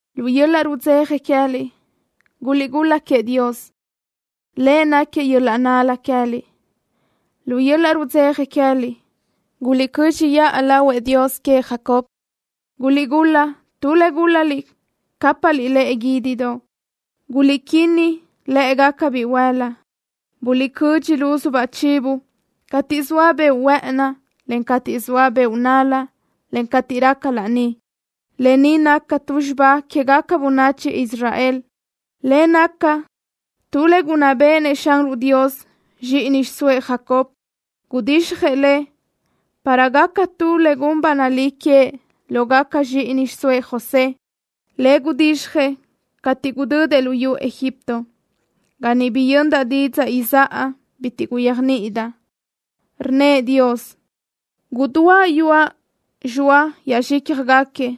Lu yöl-laʼ rudzeja queë́liʼ guliʼgul-la queëʼ Dios. Lëʼ náquiëʼ yöl-laʼ nál-la queë́liʼ. Lu yöl-laʼ rudzeja queë́liʼ guliʼcö́dxiʼa lahuëʼ Dios queëʼ Jacob. Guliʼgul-la tu le gúl-laliʼ, cápaʼliʼ lëʼe guídidoʼ. Guliʼquinnaj lë́ʼegaca bihuël-la. Guliʼcödxi luzu chivo cateʼ zoa beoʼ huë́ʼëni, en cateʼ zoa beoʼ nál-la, en cateʼ raca laní. Lë ni naca tu xibá quégaca bönachi Israel, le naca tu le gunná béʼenëʼ Xanruʼ Dios zxíʼini xiʼsóëʼ Jacob. Gudixjëʼ le para gaca tu le gun ba nalí queëʼ lógaca zxíʼini xiʼsóëʼ José, le gudixjëʼ cateʼ gudödëʼ luyú Egipto, ga niʼ biyöndaʼ didzaʼ izáʼa bitiʼ guyéajniʼidaʼ. Rnnëʼ Dios: “Gudúaʼ yuaʼ zxoa yaʼzxícjagaquiëʼ,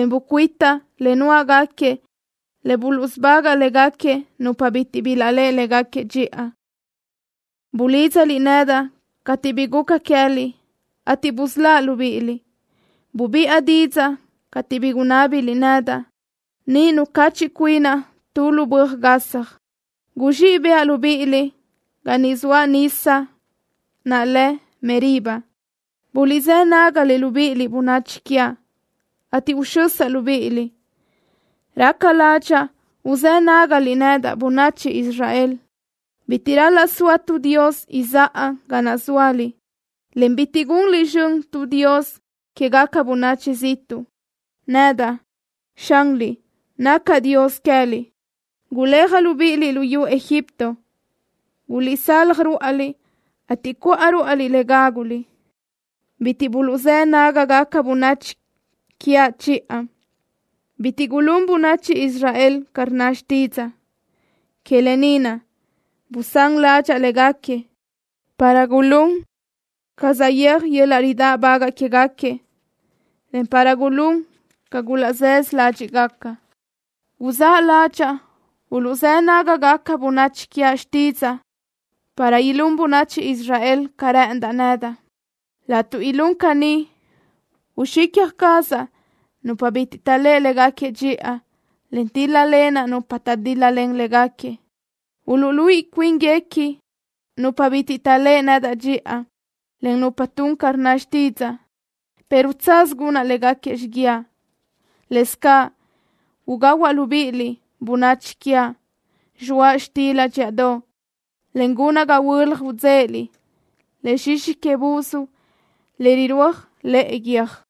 en bucuitaʼ le nuáʼgaquiëʼ le buluʼsubagaʼ légaquiëʼ nupa bitiʼ bilaʼléʼe légaquiëʼ dxiʼa. Bulídzaliʼ nedaʼ cateʼ bi guca queë́liʼ, ateʼ busöláʼ libíʼiliʼ. Bubiʼa didzaʼ cateʼ bi gunábiliʼ nedaʼ, niʼ nucachiʼ cuinaʼ tu lu böaj gasaj. Guzxíʼ bëʼa libíʼiliʼ ga zoa nisa naʼ lë Meriba. Buliʼzë́ nágaliʼ, libíʼiliʼ, bönachi quiaʼ, ateʼ uxösaʼ libíʼiliʼ. Raca ládxaʼa uzë́ nágaliʼ nedaʼ, bönachi Israel. Bitiʼ ral-laʼ soa tu dios izáʼa ga naʼ zóaliʼ, en bitiʼ gunliʼ zxön tu dios quégaca bönachi ziʼtuʼ. Nedaʼ, Xanliʼ, nacaʼ Dios queë́liʼ. Guléajaʼ libíʼiliʼ luyú Egipto. Guliʼsalaj ruáʼaliʼ, ateʼ cuʼa ruáʼaliʼ le gáguliʼ. Bitiʼ buluʼzë́ nágagaca bönachi quiaʼ chiʼa. Bitiʼ gulún bönachi Israel ca rnna xtídzaʼa. Que lë ni naʼ busán ládxaʼa léguequi para gulún ca saʼyéaj yöl-laʼ ridáʼbagaʼ quéguequi, en para gulún ca gulaʼzaʼsö ládxiʼgaca. Guzáʼ ládxaʼa uluʼzë́ nágagaca bönachi quiaʼ xtídzaʼa, para ilún bönachi Israel ca rë́ʼëndaʼ nedaʼ. Laʼtuʼ ilún caní, uxicja cazaʼ nupa bitiʼ taʼléʼe léguequi dxiʼa, en tíl-lalenaʼ nupa taʼdíl-lalen léguequi. Uluʼluíʼi cuínguequi nupa bitiʼ taʼléʼe nedaʼ dxiʼa, ca nupa tun ca rnna xtídzaʼa, pero tsaz gunaʼ léguequi xiguiaʼ. Lëscaʼ ugahuaʼ libíʼiliʼ, bönachi quiaʼ, zxoaʼ xtila dxíʼadoʼ, en gunaʼ ga huölaj idzéʼeliʼ le zxixi que buz, le irúaj lëʼe guiö́j.”